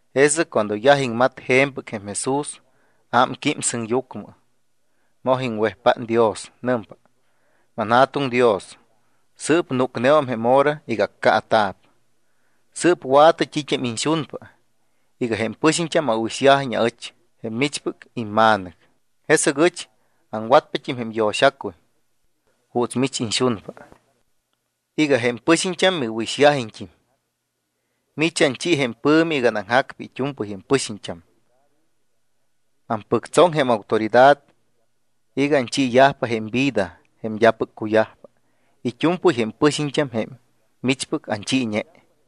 Jesɨc cuando yaj iŋmat je̱mpɨc jém Jesús, ámquím sɨŋyucmɨ. Moj iŋwejpát Dios. Nɨmpa: —ManJa̱tuŋ Dios, sɨɨp núcneum jém hora iga accaata̱p. Sɨɨp wa̱tɨ t́it́am iñxunpa iga jém pɨxiñt́am awɨ̱ixyajiñ aɨch, jém michpɨc imma̱nɨc. Jesɨc ɨch aŋwatpat́im jém yo̱xacuy juuts mich iñxunpa iga jém pɨxiñt́am miwɨ̱ixyajiñt́im. Mich anchi jém pɨ̱mi iga anaŋjacpa it́u̱mpɨy jém pɨxiñt́am. Ampɨctsoŋ jém autoridad iga anchiiyajpa jém vida jém d́apɨc cuyajpa it́u̱mpɨy jém pɨxiñt́am jém michpɨc anchiiñe.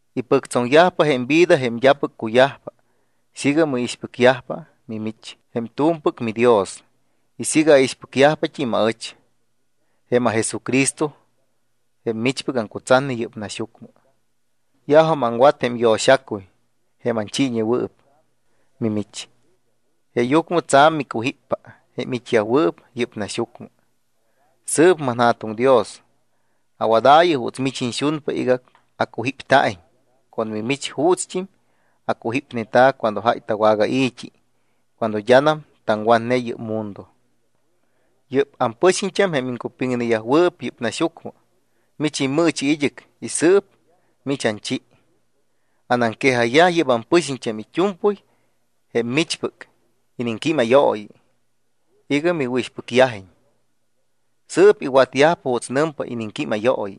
Ipɨctsoŋyajpa jém vida jém d́apɨc cuyajpa siiga miixpɨcyajpa mimich jém t́u̱mpɨc miDios y siiga aixpɨcyajpat́im aɨch, jém aJesucristo jém michpɨc aŋcutsatne yɨ́p naxyucmɨ. ’Yajum aŋwat jém yo̱xacuy jém anchiiñewɨɨp mimich, jeeyucmɨ tsa̱m micujípyajpa jém it́yajwɨɨp yɨ́p naxyucmɨ. Sɨɨp manJa̱tuŋ Dios, awadaayɨ juuts mich iñxunpa iga acujípta̱iñ con mimich juutst́im acujípneta̱ cuando jáy tawagai̱t́i cuando d́anam taŋwatne yɨ́p mundo. ’Yɨ́p ampɨxiñt́am, jém iŋcupiŋnewɨɨp yɨ́p naxyucmɨ, mich immɨɨchi id́ɨc y sɨɨp mich anchi. Anaŋquejayyaj yɨ́p ampɨxiñt́am it́u̱mpɨy jém michpɨc iniŋquímayooyi iga miwɨ̱ixpɨcyajiñ. Sɨɨp iwatyajpa juuts nɨmpa iniŋquímayooyi.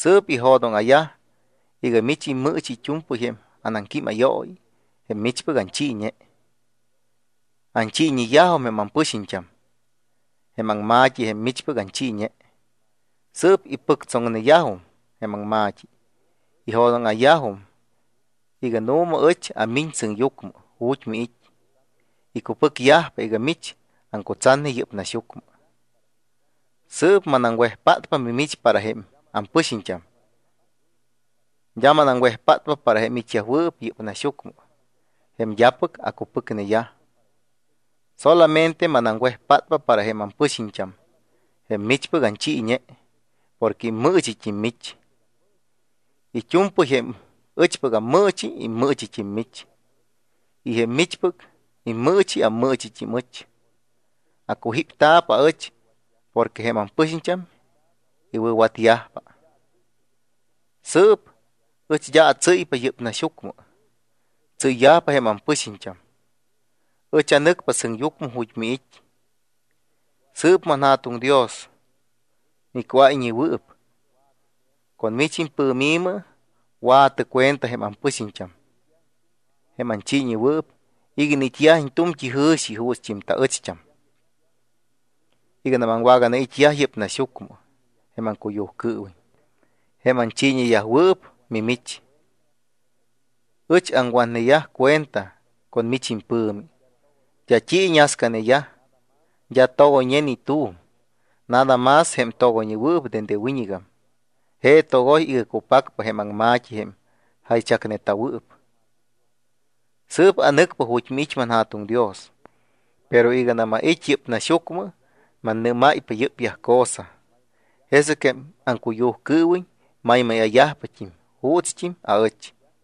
Sɨɨp ijo̱dóŋa̱yaj iga mich immɨɨchi it́u̱mpɨy jém anaŋquímayooyi jém michpɨc anchiiñe. Anchiiñeyajum jém ampɨxiñt́am jém aŋma̱t́i, jém michpɨc anchiiñe. Sɨɨp ipɨctsoŋneyajum jém aŋma̱t́i y ijo̱dóŋa̱yajum iga nu̱ma ɨch amiñ sɨŋyucmɨ ju̱t́ miit́. Icupɨcyajpa iga mich aŋcutsatne yɨ́p naxyucmɨ. ’Sɨɨp manaŋwejpátpa mimich para jém ampɨxiñt́am. D́a manaŋwejpátpa para jém it́yajwɨɨp yɨ́p naxyucmɨ jém d́apɨc acupɨcneyaj. Solamente manaŋwejpátpa para jém ampɨxiñt́am jém michpɨc anchiiñe porque immɨɨchit́im mich. It́u̱mpɨy jém ɨchpɨc ammɨɨchi, immɨɨchit́im mich. Y jém michpɨc immɨɨchi, ammɨɨchit́im ɨch. Acujípta̱p aɨch porque jém ampɨxiñt́am iwɨ̱watyajpa. ’Sɨɨp ɨch d́a atsɨ́ypa yɨ́p naxyucmɨ. Tsɨ́yyajpa jém ampɨxiñt́am. Ɨch anɨcpa sɨŋyucmɨ ju̱t́ miit́. Sɨɨp manJa̱tuŋ Dios, miCuáyñewɨɨp, con mich impɨ̱mi wa̱tɨ cuenta jém ampɨxiñt́am jém anchiiñewɨɨp iga iniit́yajiñ tu̱mt́i jɨ̱xi juutst́im taɨcht́am. Iganam aŋwaganait́yaj yɨ́p naxyucmɨ jém aŋcuyujcɨɨwiñ, jém anchiiñeyajwɨɨp mimich, ɨch aŋwatneyaj cuenta con mich impɨ̱mi. D́a t́i iñascaneyaj. D́a togoyñe ni tu̱m, nada más jém togoyñewɨɨp dende wiñɨgam. Je togoy iga cupacpa jém aŋma̱t́i jém jaychacneta̱wɨɨp. ’Sɨɨp anɨcpa ju̱t́ miit́, manJa̱tuŋ Dios. Pero iganam ait́ yɨ́p naxyucmɨ, mannɨ́máypa yɨ́pyaj cosa, jesɨc jém aŋcuyujcɨɨwiñ maymáya̱yajpat́im juutst́im aɨch.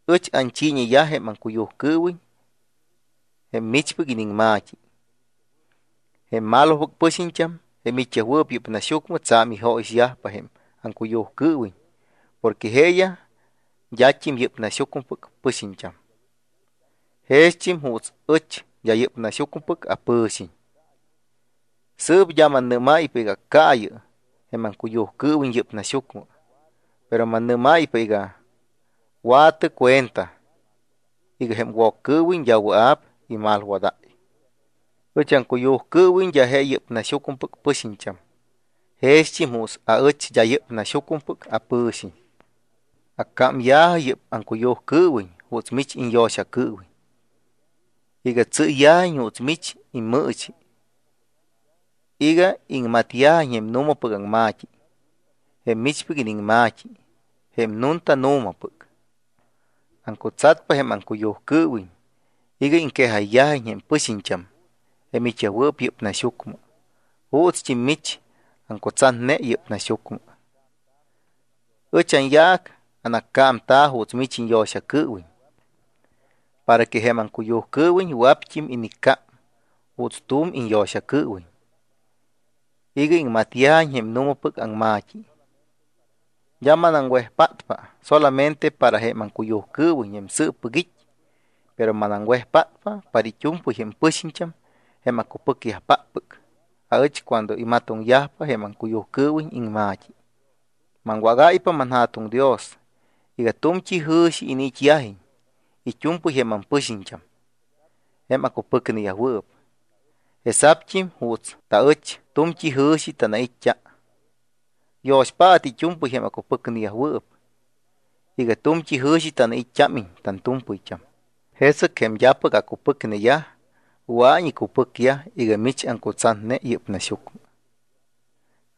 Ɨch anchiiñeyaj jém aŋcuyujcɨɨwiñ jém michpɨc iniŋma̱t́i. Jém malopɨc pɨxiñt́am, jém it́yajwɨɨp yɨ́p naxyucmɨ, tsa̱m ijóyixyajpa jém aŋcuyujcɨɨwiñ porque jeeyaj d́at́im yɨ́p naxyucmɨpɨc pɨxiñt́am. Jext́im juuts ɨch d́a yɨ́p naxyucmɨpɨc apɨ̱xiñ. Sɨɨp d́a mannɨ́máypa iga accaayɨ jém aŋcuyujcɨɨwiñ yɨ́p naxyucmɨ. Pero mannɨ́máypa iga wa̱tɨ cuenta iga jém Woccɨɨwiñ d́a wɨa̱p imalwadáy. Ɨch aŋcuyujcɨɨwiñ d́a je yɨ́p naxyucmɨpɨc pɨxiñt́am, jext́im juuts aɨch d́a yɨ́p naxyucmɨpɨc apɨ̱xiñ. Accámya̱jɨ yɨ́p aŋcuyujcɨɨwiñ juuts mich iñyo̱xacɨɨwiñ iga tsɨ́yyajiñ juuts mich immɨɨchi iga iŋmatyajiñ jém nu̱mapɨc aŋma̱t́i. Jém michpɨc iniŋma̱t́i jém nunta nu̱mapɨc. Aŋcutsatpa jém aŋcuyujcɨɨwiñ iga iŋquejayyajiñ jém pɨxiñt́am jém it́yajwɨɨp yɨ́p naxyucmɨ juutst́im mich aŋcutsatne yɨ́p naxyucmɨ. Ɨch anyaac anaccámta̱ juuts mich iñyo̱xacɨɨwiñ para que jém aŋcuyujcɨɨwiñ wɨa̱pt́im iniccám juuts tu̱m iñyo̱xacɨɨwiñ iga iŋmatyajiñ jém nu̱mapɨc aŋma̱t́i. ’D́a manaŋwejpátpa solamente para jém aŋcuyujcɨɨwiñ jém sɨɨppɨc it́, pero manaŋwejpátpa para it́u̱mpɨy jém pɨxiñt́am jém acupɨcyajpáppɨc aɨch cuando imatoŋyajpa jém aŋcuyujcɨɨwiñ iŋma̱t́i. Maŋwágáypa, manJa̱tuŋ Dios, iga tu̱mt́i jɨ̱xi iniit́yajiñ it́u̱mpɨy jém ampɨxiñt́am jém acupɨcneyajwɨɨp, jesa̱pt́im juuts taɨch tu̱mt́i jɨ̱xi tanait́t́a. Yo̱xpaatɨ it́u̱mpɨy jém acupɨcneyajwɨɨp iga tu̱mt́i jɨ̱xi tanait́t́ámiñ tantu̱mpɨyt́am. Jesɨc jém d́apɨc acupɨcneyaj, wɨa̱iñ icupɨcyaj iga mich aŋcutsatne yɨ́p naxyucmɨ.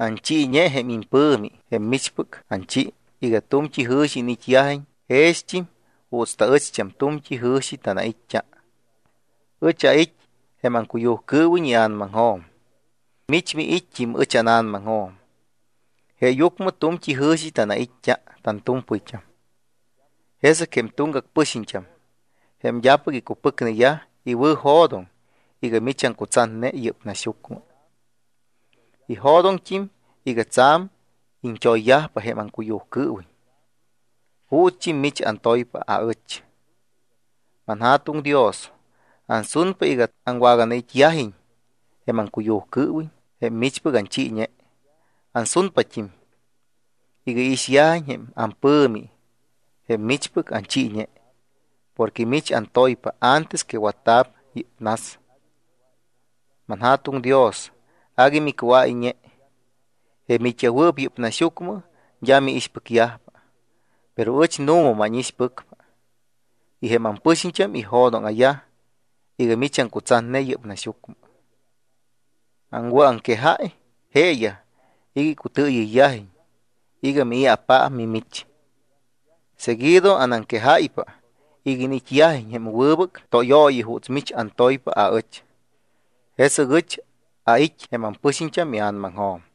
Anchiiñe jém impɨ̱mi, jém michpɨc anchi, iga tu̱mt́i jɨ̱xi iniit́yajiñ jext́im juuts taɨcht́am tu̱mt́i tanjɨ̱xi tanait́t́a. Ɨch ait́ jém aŋcuyujcɨɨwiñ ia̱namaŋjo̱m. Mich miit́t́im ɨch ána̱namaŋjo̱m. Jeeyucmɨ tu̱mt́i jɨ̱xi tanait́t́a tantu̱mpɨyt́am. Jesɨc jém tuŋgac pɨxiñt́am, jém d́apɨc icupɨcneyaj, iwɨ̱jo̱doŋ iga mich aŋcutsatne yɨ́p naxyucmɨ. Ijo̱doŋt́im iga tsa̱m iñt́oyyajpa jém aŋcuyujcɨɨwiñ juutst́im mich antoypa aɨch. ’ManJa̱tuŋ Dios, ansunpa iga aŋwaganait́yajiñ jém aŋcuyujcɨɨwiñ, jém michpɨc anchiiñe. Ansunpat́im iga iixyajiñ jém ampɨ̱mi jém michpɨc anchiiñe porque mich antoypa antes que watta̱p yɨ́p nas. ManJa̱tuŋ Dios, agui micuáyñe. Jém it́yajwɨɨp yɨ́p naxyucmɨ d́a miixpɨcyajpa, pero ɨch, nu̱ma mánixpɨcpa y jém ampɨxiñt́am ijo̱dóŋa̱yaj iga mich aŋcutsatne yɨ́p naxyucmɨ. Aŋwɨ̱aŋquejáy jeeyaj iga icutɨɨyɨyyajiñ iga mii̱apaap mimich. Seguido anaŋquejáypa iga iniit́yajiñ jém wɨbɨc tóyooyi juuts mich antoypa aɨch. Jesɨc ɨch ait́ jém ampɨxiñt́am ia̱namaŋjo̱m.